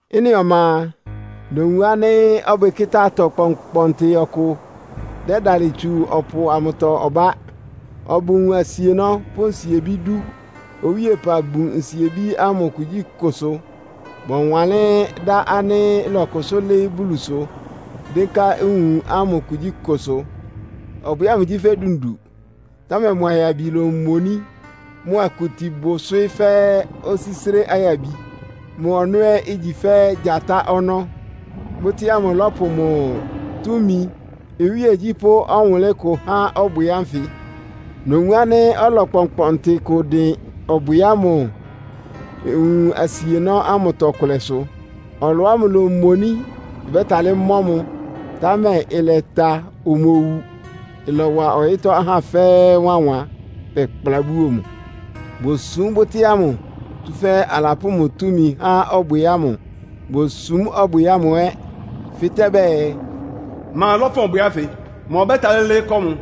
Ɩ́nɩ ɔma a, nowun ánɩ́ ɔbwɩkɩ́tá-atɔ kpɔnkpɔntɩ ɔkʋ dɛ́dalɩ tsu ɔpʋ amʋtɔ ɔbá. Ɔbʋ nwun asienɔ́ pʋ́ nsiebí dú. Owíepa bun nsiebí ámʋ kugyíkʋsʋ. Bɔwanlɩ́n dá ánɩ́ ɩlɔkʋsʋ́ lɩ́ɩ́ Bulusʋ dɩ́nká nwun ámʋ kugyíkʋsʋ. Ɔbwɩ ámʋ gyí fɛ́ dundu, támɛ mʋ ayabi lomoní, mʋ akuti bʋ ɩswɩ́ fɛ́ osísré ayabi, mʋ ɔnɔ́ ɛ́ igyi fɛ́ gyatá ɔnɔ́. Bʋ́tɩ́ ámʋ lɔ́pʋ mʋ túmi, iwíegyí pʋ́ ɔwʋnlɩ́n kʋ há ɔbwɩ ánfɩ. Nowun ánɩ́ ɔlɔ kpɔnkpɔntɩ kʋ ɩdɩn ɔbwɩ ámʋ nwun asienɔ́ ámʋtɔ kʋlɛsʋ. Ɔlɔ ámʋ lómoní, ɩbɛ́talɩ́ mɔ́ mʋ, támɛ ɩlɛta, omowu. Ɩlɔwa ɔyɩ́tɔ́ ahá fɛ́ɛ́ wánwan, bɛkplá buo mʋ. Bosúm bʋ́tɩ́ ámʋ, tsúfɛ́ alapʋ́ mʋ túmi há ɔbwɩ ámʋ. Bosúm ɔbwɩ ámʋ ɛ́, fɩ́tɛ́ bɛɛ, “Ma lɔ́fʋn ɔbwɩ ánfɩ? Ma ɔbɛ́talɩ́ lɩ́ɩ́ kɔ́ mʋ?”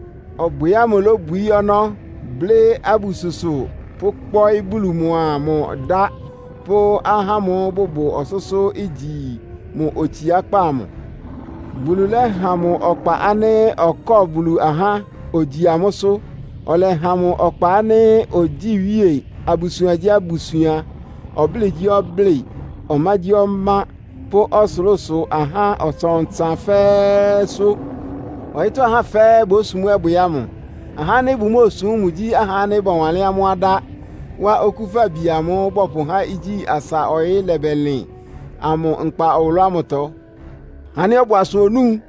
Ɔbwɩ ámʋ lóbwií ɔnɔ́, blɩ́ abususʋ pʋ́kpɔ́ɩ́ Bulu mʋa mʋ dá pʋ́ ahá ámʋ́ʋ́ bʋbʋ ɔsʋ́sʋ́, igyi mʋ otsiákpá amʋ. Bulu lɛ́ha mʋ ɔkpa ánɩ́ ɔkɔ́ɔ Bulu ahá, ogyi amʋ́sʋ́. Ɔlɛha mʋ ɔkpa ánɩ́ ogyíi iwíe abusuangyíabusuan, ɔblɩ́ɩgyíɔblɩ́ɩ, ɔmágyíɔmá pʋ́ ɔsʋlʋ́sʋ ahá ɔtsan-ɔtsan fɛ́ɛ́sʋ́. Ɔyɩ́tɔ́ ahá fɛ́ɛ́ bósum ɔbwɩ ámʋ. Ahá ánɩ́ bʋmóosum mʋ gyí ahá ánɩ́ bɔwanlɩ́n amʋ́ adá wá Okúfabi amʋ́ʋ́ bɔpʋhá igyí asa ɔyɩ́ lɛbɛlɩn amʋ nkpa ɔwʋlʋ́tɔ́. Ɔhá ánɩ́ ɔbʋ asʋ onúu.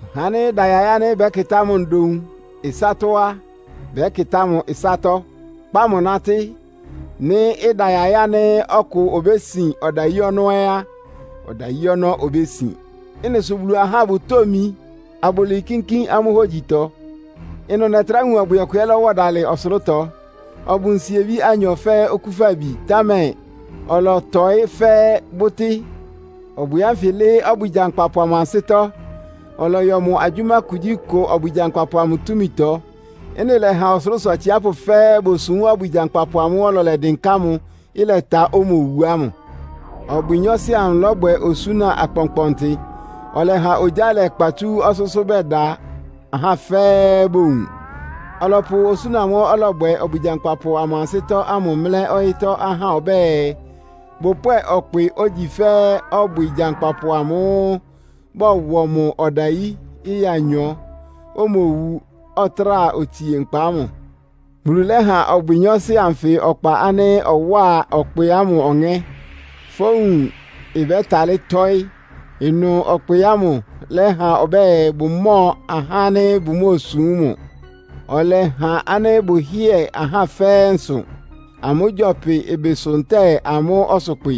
Ɔhá ánɩ́ ɩda yaɩ́ ánɩ́ bɛ́kɩtá mʋ ndoun ɩsátɔ́ a, bɛ́kɩtá mʋ ɩsátɔ́, kpá mʋ nátɩ́. Nɩ́ ɩda yaɩ́ ánɩ́ ɔkʋ obésin ɔdayí ɔnɔ́ ɛ́ á, ɔdayí ɔnɔ́ obésin. Ɩ́nɩ sʋ Bulu ahá bʋtómi, abʋlɩɩ kínkín amʋ́ hógyitɔ. Ɩnʋ nɛtrá wun ɔbwɩ ɔkʋ ɛ́ lɔ́wɔ dalɩ ɔsʋlʋ́tɔ. Ɔbʋ nsiebí anyɔ fɛ́ okúfabi, támɛ ɔlɔtɔɩ́ fɛ́ bʋ́tɩ́. Ɔbwɩ ánfɩ lɩ́ɩ́ ɔbwɩ gyankpapʋ amʋ ansɩ́tɔ́, ɔlɔyɔ mʋ agyʋ́má kugyíkʋ ɔbwɩ gyankpapʋ amʋ túmitɔ. Ɩ́nɩ lɛ́ha ɔsʋlʋ́sʋ atsiápʋ́ fɛ́ɛ́ bosúm ɔbwɩ gyankpapʋ amʋ́ʋ́ ɔlɔ lɛdɩnká mʋ, ɩlɛta, omowu ámʋ. Ɔbwɩ nyɔɔsɩ amʋ lɔ́bwɛ osúna akpɔnkpɔntɩ. Ɔlɛha ogyá lɛkpa tsú ɔsʋ́sʋ́ bɛda, ahá fɛ́ɛ́ bowun. Ɔlɔpʋ osúna amʋ́ʋ́ ɔlɔbwɛ ɔbwɩ gyankpapʋ amʋ ansɩ́tɔ́ ámʋ mlɛ́ ɔyɩ́tɔ́ ahá ɔbɛ́ɛ, bʋpwɛ́ɛ ɔkpɩ, ogyi fɛ́ ɔbwɩ gyankpapʋ amʋ́ʋ́ bɔwɔ mʋ ɔdayí ɩya anyɔ, omowu, ɔtráa otsie nkpa ámʋ. Bulu lɛ́ha ɔbwɩ nyɔɔsɩ anfɩ ɔkpa ánɩ́ ɔwáa ɔkpɩ ámʋ ɔŋɛ́, fówun ɩbɛ́talɩ́ tɔ́ɩ́. Ɩnʋ ɔkpɩ ámʋ lɛ́ha ɔbɛ́ɛ, bʋmɔ́ɔ ahá ánɩ́ bʋmóosúm mʋ. Ɔlɛha ánɩ́ bʋhɩ́ɛ ahá fɛ́ɛ́ nsʋ, amʋ́ gyɔpɩ ɩbɩsʋ ntɛ́ɛ amʋ́ ɔsʋkpɩ;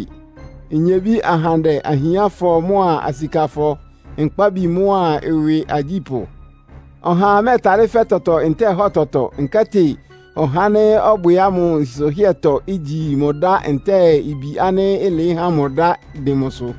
nyebí ahandɛ, ahiánfɔ mʋ́a asikafɔ, nkpábi mʋ́a ɩwɩ agyípʋ́. Ɔhaa mɛ́ɛtalɩ́ fɛ́ tɔtɔ ntɛ́ɛ hɔ tɔtɔ, nkɛ́tɩ ɔhá ánɩ́ ɔbwɩ ámʋ nsʋhɩ́ɛtɔ, igyi mʋ ɩdá ntɛ́ɛ ibi ánɩ́ ɩlɩɩ́ há mʋ ɩdá dɩn mʋsʋ.